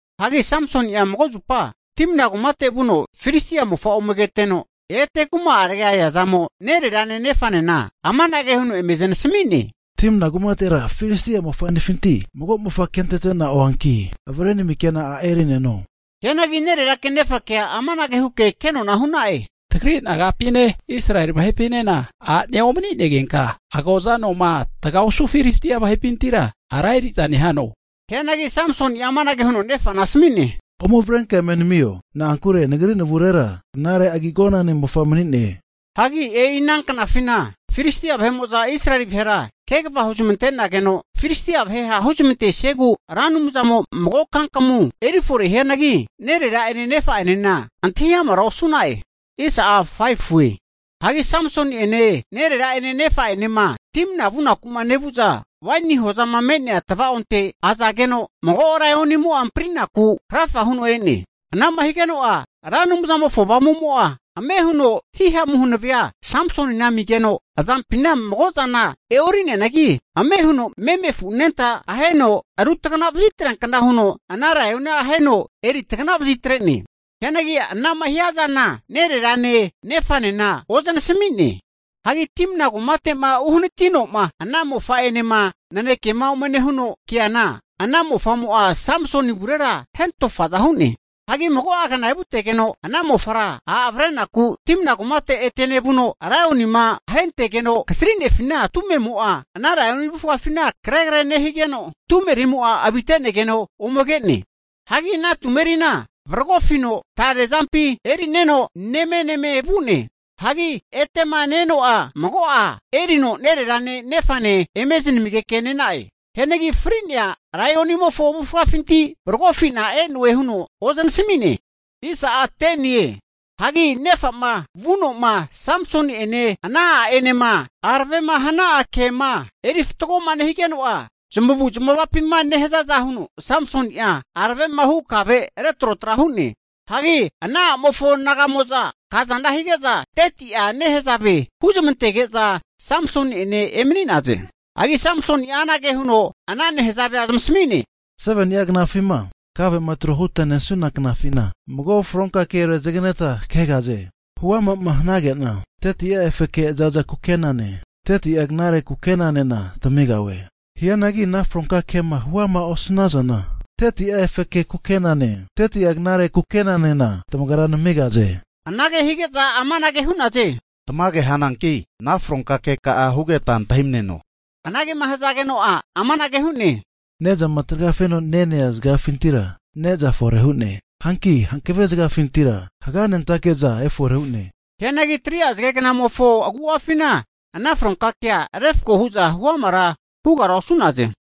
Hagi Samsoni'a mago zupa Timna kumate vuno Filistia vahe mofa ome keteno, ete kuma'arega eazamo nererane nefanena amanage huno eme zanasami'ne. Timna kumatera Filistia mofa'nefinti mago mofa kentete'na oanki avrenamike'na a' eri'neno. Hianagi nererake nefakea amanage huke kenona hu'na'e, Tagri nagapine Israeli vahepinena a'nea omani'negenka, agoza anoma taga osu Filistia vahepintira ara eri'za nehano? Hianagi Samsoni'a amanage huno nefana asami'ne, Ome avrenka eme namio. Na'ankure nagri navurera knare agi agonane mofa mani'ne. Hagi e'i ana knafina Filistia vahe'mo'za Israeli vahera kegava huzamante'nageno, Filistia vahe ha' huzmantesiegu Ra Anumzamo mago kankamu eri fore hianagi, nerera'ene nefa'enena antahi amara osu'na'e. Hagi Samsoni'ene nerera'ene nefa'enema Timna vunaku nevu'za, waini hozama me'nea tava'onte azageno, mago laionimo'a amprinaku krafa huno e'ne. Ana'ma higeno'a Ra Anumzamofo Avamu'mo'a ame huno himamu hanavea Samsonina amigeno, azampina mago zana e'ori'neanagi ame' huno meme afu anenta aheno rutagana vazitreankna huno ana laionia aheno eritagna vazitre'ne. Hianagi ana'ma hiazana nererane, nefanena ozanasami'ne. Hagi Timna kumate'ma uhanatino'ma ana mofa'enema nanekema ome nehuno keana, ana mofa'mo'a Samsoni avurera hentofaza hu'ne. Hagi mago'a kna evutegeno, ana mofara a' avrenaku Timna kumate ete nevuno, laionima ahentegeno kasrinefina tumemo'a ana laioni avufgafina karegre nehigeno, tumerimo'a avite'negeno ome ke'ne. Hagi ana tumerina varagofino tare azampi erineno nemeneme vu'ne. Hagi etema ne-eno'a mago'a erino nererane nefane eme zanamigeke ne'na'e. Hianagi fri'nea laionimofo avufgafinti varagofina e'noe huno ozanasami'ne. Hagi nefa'ma vuno'ma Samsoni'ene ana a'enema aravema hana'a kema eri fatgoma nehigeno'a, zamavuzmavapima nehazaza huno Samsoni'a aravema hu kave retrotra hu'ne. Hagi ana a'mofo naga'mo'za kazana hige'za 30'a nehazave huzamantege'za Samsoni'ene emani'naze. Hagi Samsoni'a anage huno ana nehazavea zamasami'ne, 7ni'a knafima kavema trohuta nesuna knafina, mago fronka ke tamasamigahunki rezaganeta kegahaze. Huama'ma hanage'na 30'a efeke zaza kukenane, 30'a knare kukenanena tamigahue. Hianagi ana fronka kema huama osanazana, 30'a efeke kukenane 30'a knare kukenanena tamagra namigahaze. Anage hige'za amanage hu'naze, Tamage hananki ana fronka keka'a hugeta antahimaneno. Anagema hazageno'a amanage hu'ne, Ne'zama tragafeno nenea zagafintira ne'za fore hu'ne. Hanki hankave zagafintira haganentake'za efore hu'ne. Hianagi 3'a zagegnamofo agu'afina ana fronka kea refko hu'za huamara hugara osu'naze.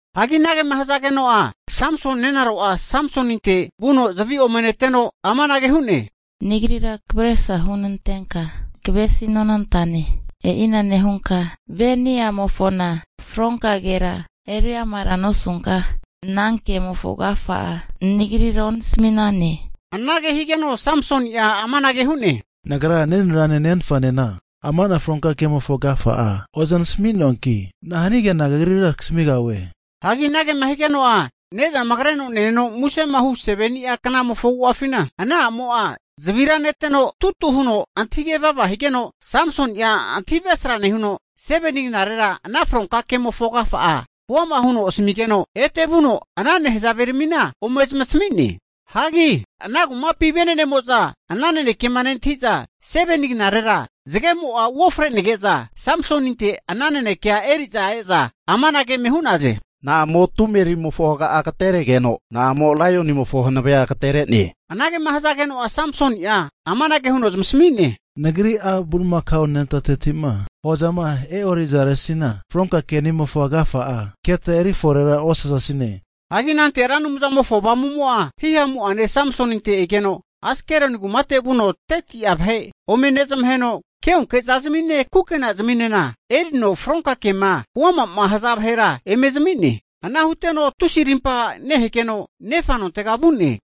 Hagi anagema hazageno'a, Samsoni nenaro'a Samsoninte vuno zavi ome neteno amanage hu'ne, Nagrira kavresra hunantenka kavesinonantane. E'ina nehunka vahe'ni'amofona fronka kea eri amara nosunka ana kemofo agafa'a nagrira onasami'nane. Anage higeno Samsoni'a amanage hu'ne, Nagra nenererane nenfanena amana fronka kemofo agafa'a ozanasami'noanki, nahanige'na kagrira kasamigahue? Hagi anagema higeno'a, Ne'zama kreno neneno musema hu 7ni'a knamofo agu'afina, ana a'mo'a zavira neteno tutu huno antahige vava higeno, Samsoni'a antahi avesra nehuno, 7ni knare ana fronka kemofo agafa'a huama huno nenarona asamigeno, ete vuno ana nehazaveramina ome zamasami'ne. Hagi ana kumapi vene'nemo'za ana nanekema nentahi'za, 7ni knarera zagemo'a uofre'nege'za Samsoninte ana nanekea eri'za e'za amanage eme hu'naze, Na'amo tumerimofo haga'a agateregeno, na'amo laionimofo hanavea agatere'ne? Anagema hazageno'a, Samsoni'a amanage huno zamasami'ne, Nagri a' bulimakao anentateti'ma hozama e'orizaresina fronka keni'amofo agafa'a keta eriforera osazasine. Hagi anante Ra Anumzamofo Avamumo'a himamu'ane Samsoninte egeno Askeloni kumate vuno 30'a vahe ome nezamaheno, keonke'zazimine, kukenaziminena erino fronka kema huama'ma haza vahera eme zami'ne. Ana huteno tusi arimpa nehegeno nefa nontega vu'ne.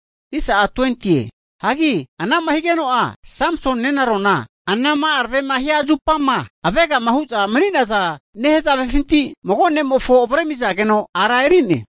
Hagi anama higeno'a, Samsoni nenarona, anama aravema hia zupama avegama hu'za mani'naza nehazavefinti mago ne'mofo avremizageno ara eri'ne.